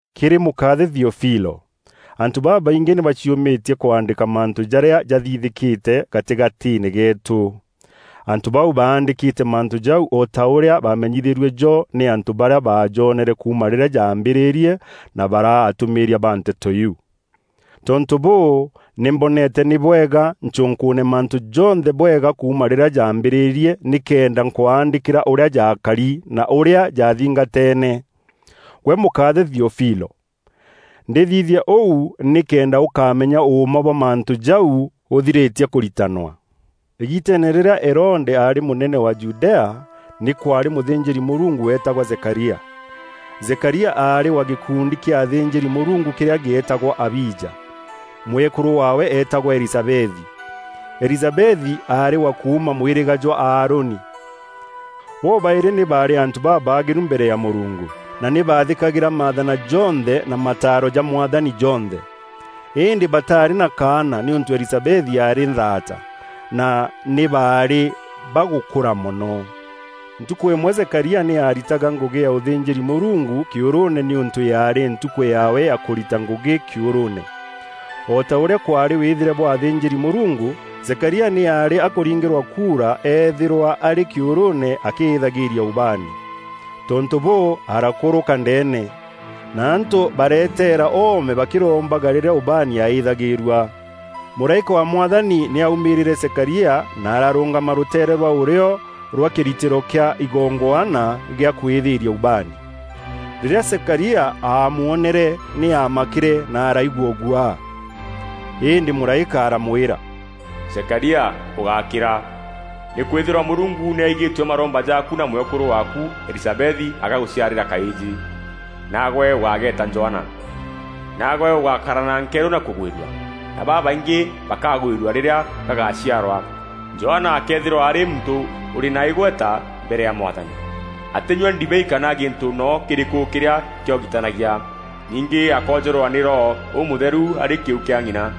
Kîrî mûkaathe Theofilo, Antû babaingî nî baciûmîtie kwaandîka mantû jarîa jathithîkîte gatîgatîîne geetû. Antû bau baandîkîte mantû jau o ta ûrîa baamenyithîrue jo nî antû barîa baajonere kuuma rîrîa jaambîrîrie na baraa atûmîîria ba nteto iu. Tontû bûû, nî mboneete nî bwega ncûnkûûne mantû jonthe bwega kuuma rîrîa jaambîrîrie nîkenda nkwaandîkîra ûrîa jaakari na ûrîa jaathingateene, gwe Mûkaathe Theofilo. Ndîthithia ûu nîkenda ûkamenya ûûma bwa mantû jau ûthirîtie kûritanwa. Îgiiteene rîrîa Herode aarî mûnene wa Judea, nî kwaarî mûthînjîri-Mûrungu weetagwa Zekaria. Zekaria aarî wa gîkundi kîa athînjîri-Mûrungu kîrîa gîetagwa Abija. Mwekûrû waawe eetagwa Elizabethi. Elizabethi aarî wa kuuma mwîrîga jwa Aaroni. Bo-baîrî nî baarî antû babaagîru mbere ya Mûrungu, na nî baathîkagîra maathana jonthe na mataaro ja Mwathani jonthe. Îndî bataarî na kaana nîûntû Elizabethi aarî nthaata, na nî baarî bagûkûra mono. Ntukû îmwe Zekaria nî aaritaga ngûgî ya ûthînjîri Mûrungu kîûrûûne nîûntû yaarî ntukû yaawe ya kûrita ngûgî kîûrûûne. O ta ûrîa kwaarî wîthîre bwa athînjîri-Mûrungu, Zekaria nî aarî akûringîrwa kuura eethîrwa arî kîûrûûne akîîthagîria ubaani. Tontû bûû, arakûrûka ndeene, na antû bareeteera oome bakîrombaga rîrîa ubaani yaaîthagîrua. Mûraîka wa Mwathani nî aumîrîîre Zekaria na ararûngama rûteere rwa ûrîo rwa kîritîro kîa igongwana gîa kwîîthîria ubaani. Rîrîa Zekaria aamwonere nî aamakîre na araigua ûguaa. Îndî mûraîka aramwîra, “Zekaria ûgákîra, nîkwîthîrwa Mûrungu nî aigîtue maromba jaaku na mwekûrû waaku Elizabethi agagûciarîra kaîjî, naagwe ûgageeta Johana. Naagwe ûgakara na nkerû na kûgwîrua, na babaingî bakagwîrua rîrîa gagaciarwa. Johana akeethîrwa arî muntû ûrî na îgweta mbere ya Mwathani. Atînyua ndibei kana gintû noo kîrîkû kîrîa kîogitanagia. Ningî akoojûrwa nî Roho Ûmûtheru arî kîu kîa ng'ina.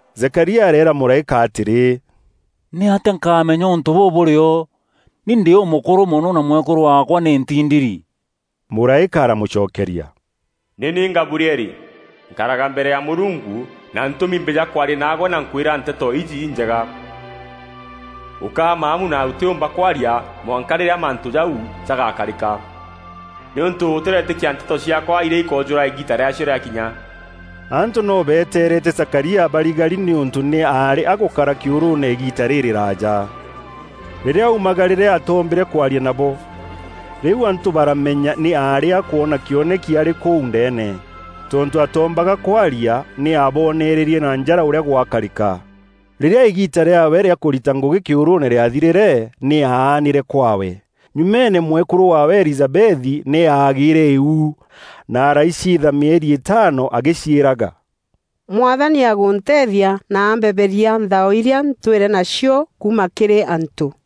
Zekaria areera mûraîka atîrî, “Nîatîa nkamenya ûntû bûu bûrîo? Ni ndî ûmûkûrû mono na mwekûrû waakwa nî ntindiri?” Mûraîka aramûcokeria, “Nî ni Gabrieli. Nkaraga mbere ya Mûrungu, na ntûmi mbîja kwaria naagwe na nkwîra nteto iji injega. Ûkaa maamu na ûtîûmba kwaria mwanka rîrîa mantû jau jagakarîka, nîûntû ûtîretîkia nteto ciaakwa, irîa ikoojûra îgiita rîaacio rîakinya.” Antû noo beetereete Zekaria, barigari nîûntû nî aarî agûkara kîûrûûne îgiita rîrîraaja. Rîrîa aumagarîre atoombîre kwaria nabo. Rîu antû baramenya nî aarî akwona kîoneki arî kûu ndeene. Tontû atoombaga kwaria, nî aaboonererie na njara ûrîa gwakarîka. Rîrîa îgiita rîaawe rîa kûrita ngûgî kîûrûûne rîathirîre, nî aanîre kwaawe. Nyumeene, mwekûrû waawe Elizabethi nî aagîîre îu na araiciitha mîeri îtaano agîciîraga, “Mwathani agûnteethia na ampeberia nthao irîa ntwîre nacio kuuma kîrî antû.”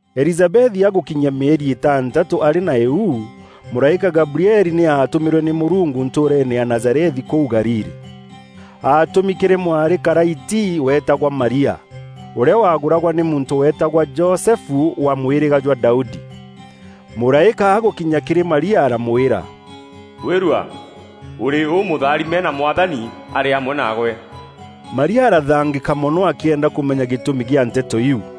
Elizabethi agûkinyia mîeri îtantatû arî na îu, mûraîka Gabrieli nî aatûmîrwe nî Mûrungu ntûûreene ya Nazarethi kûu Galili. Aatûmi kîrî mwarî karaiti weetagwa Maria, ûrîa wagûragwa nî muntû weetagwa Josefu wa mwîrîga jwa Daudi. Mûraîka agûkinya kîrî Maria aramwîra, “Gwîrua! Ûrî ûmûtharime na Mwathani arî amwe naagwe.” Maria arathangîka mono akîenda kûmenya gîtûmi kîa nteto iu.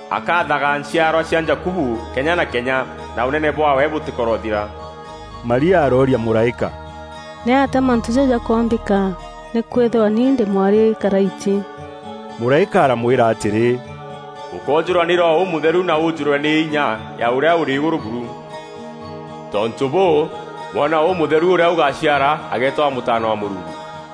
Akaathaga nchiarwa cia Jakubu kenya na kenya, na Ûnene bwaawe bûtîkorothira.” Maria arooria mûraîka, “Nîatîa mantû jau jakoombîka, nîkwîthîrwa ni ndî mwarî karaiti?” Mûraîka aramwîra atîrî, “Ûkoojûrwa nî Roho Ûmûtheru na wûûjûrwe nî inya ya Ûrîa Ûrî Îgûrû buru. Tontû bûû, mwana ûmûtheru, ûrîa ûgaciara ageetagwa Mûtaana wa Mûrungu.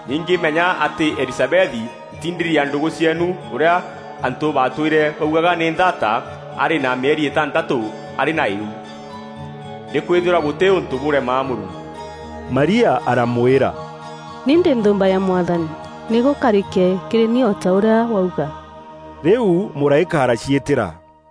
Ningî menya atî Elizabethi, ntindiri ya ndûgû cieenu, ûrîa antû batwîre baugaga nî nthaata, arî na mîeri îtantatû arî na îu. Nîkwîthîrwa gûtî ûntû bûrema Mûrungu.” Maria aramwîra, “Ni ndî nthûûmba ya Mwathani. Nî gûkarîke kîrî ni o ta ûrîa wauga.” Rîu mûraîka araciîtîra.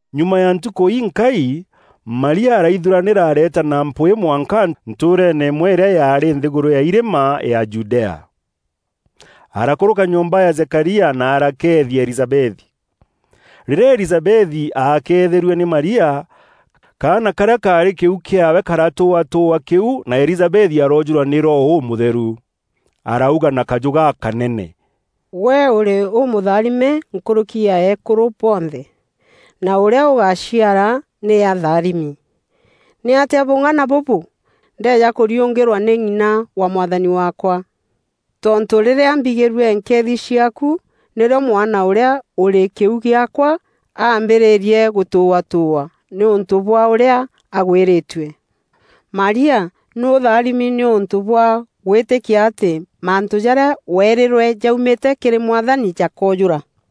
Nyuma ya ntukû inkai, Maria araithuranîra, areeta na mpwîî mwanka ntûûreene îmwe îrîa yaarî nthîgûrû ya irîma, ya Judea. Arakûrûka nyomba ya Zekaria na arakeethia Elizabethi. Rîrîa Elizabethi aakeetherue nî Maria, kaana karîa kaarî kîu kîaawe karatûûatûûa kîu na Elizabethi aroojûrwa nî Roho Ûmûtheru. Arauga na kajû gakanene, “Gwe ûrî ûmûtharime nkûrûki ya eekûrû bonthe, na ûrîa ûgaciara nî atharimi! Nîatîa bûng'ana bûbû, ndeeja kûriûngîrwa nî ng'ina wa Mwathani waakwa? Tontû rîrîa mbîgîrue nkeethi ciaaku, nîrîo mwana ûrîa ûrî kîu gîaakwa ambîrîîrie gûtûûatûûa nîûntû bwa ûrîa aagwîrîîtue. Maria, nî ûtharimi nîûntû bwa gwîtîkia atî mantû jarîa weerîrwe jaumîte kîrî Mwathani jakoojûra.”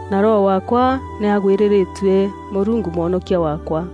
na roho waakwa nî agwîrîrîtue Mûrungu mwonokia waakwa,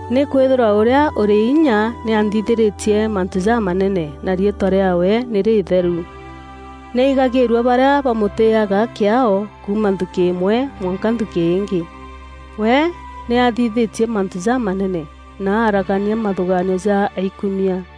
Nîkwîthîrwa Ûrîa ûrî inya nî anthithîrîtie mantû jamanene, na riîtwa rîaawe nî rîîtheru. Nî aigagîrua barîa bamûtîîaga kîaao kuuma nthukî îmwe mwanka nthukî îngî. We nî athithîtie mantû jamanene, na aragania mathûgaanio ja aikumia.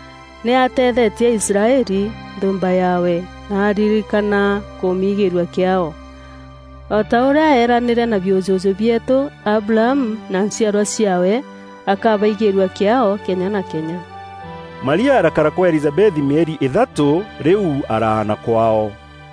Nî atethetie Israeli, nthûûmba yaawe, na aririkana kûmigîîrua kîaao, o ta ûrîa eranîîre na biûjûjû bieetû, Abrahamu na nchiarwa ciaawe, akabaigîîrua kîaao kenya na kenya.” Maria arakara kwa Elizabethi mîeri îthatû, rîu araana kwaao.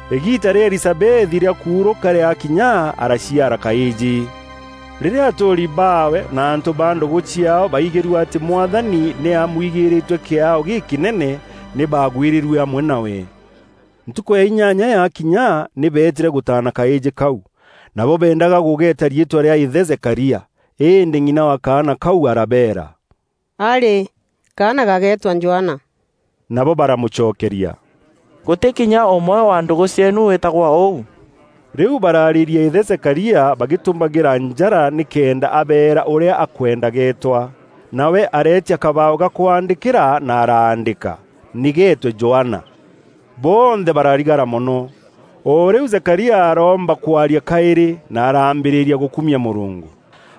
Îgiita rîa Elizabethi rîa kuurûka rîakinya araciara kaîjî. Rîrîa atûûri baawe na antû ba ndûgû ciaao baigîrue atî Mwathani nî amwigîrîîtue kîaao gîkînene, nî baagwîrîrue amwe nawe. Ntukû ya inyanya yakinya, nî beetîre gûtaana kaîjî kau. Nabo beendaga gûgeeta riîtwa rîa îthe Zekaria, îndî ng'ina wa kaana kau arabeera, “Arî! Kaana gageetwa Johana.” Nabo baramûcokeria, “Gûtî kinya ûmwe wa ndûgû cieenu wîtagwa ûu.” Rîu baraarîria îthe Zekaria bagîtumagîra njara nîkenda abeera ûrîa akwenda geetwa. Nawe areetia kabaaû ga kwaandîkîra na araandîka, “Nî geetwe Johana.” Bonthe bararigara mono. O rîu Zekaria aroomba kwaria kaîrî, na arambîrîria gûkumia Mûrungu.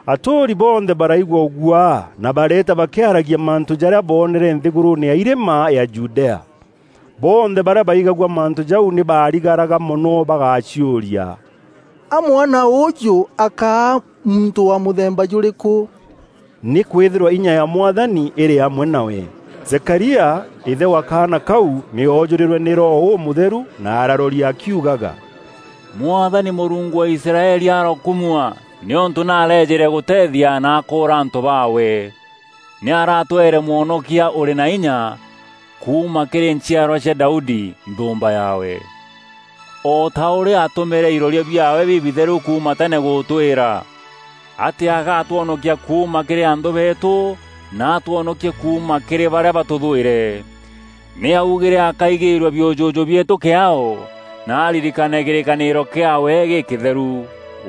Atûûri bonthe baraigua ûguaa na bareeta bakîaragia mantû jarîa boonere nthîgûrûûne ya irîma ya Judea. Bonthe barîa baigagua mantû jau nî baarigaraga mono bagaciûria, “A mwana ûûjû akaa muntû wa mûthemba jûrîkû?” Nîkwîthîrwa inya ya Mwathani îrî amwe nawe. Zekaria, îthe wa kaana kau, nî oojûrîrwe nî Roho Ûmûtheru na araroria akiugaga, “Mwathani Mûrungu wa Israeli arokumua, nîûntû nî areejîre gûteethia na aakûûra antû baawe. Nî aratweere Mwonokia ûrî na inya, kuuma kîrî nchiarwa cia Daudi, nthûûmba yaawe. O ta ûrîa aatumîîre iroria biaawe bibitheru kuuma tene gûtwîra, atî agatwonokia kuuma kîrî anthû beetû, na atwonokie kuuma kîrî barîa batûthwîre. Nî aaugîre akaigîrua biûjûjû bieetû kîaao, na aririkane kîrîkanîro kîaawe gîkîtheru.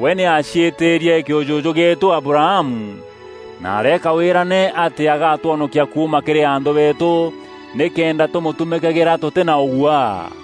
We nî aaciîtîîrie kîûjûjû gîeetû Abrahamu, na areeka wîrane atî agatwonokia kuuma kîrî anthû beetû, nîkenda tûmûtumîkagîra tûtî na ûguaa,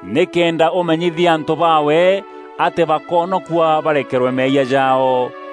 nîkenda ûmenyithia antû baawe atî bakoonokua barekerwa meeyia jaao.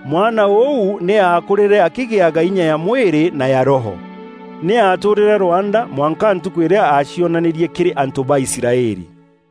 Mwana ûu nî aakûrîre akîgîaga inya ya mwîrî na ya Roho. Nî aatûûrîre rwanda mwanka ntukû îrîa aacionanîrie kîrî antû ba Israeli.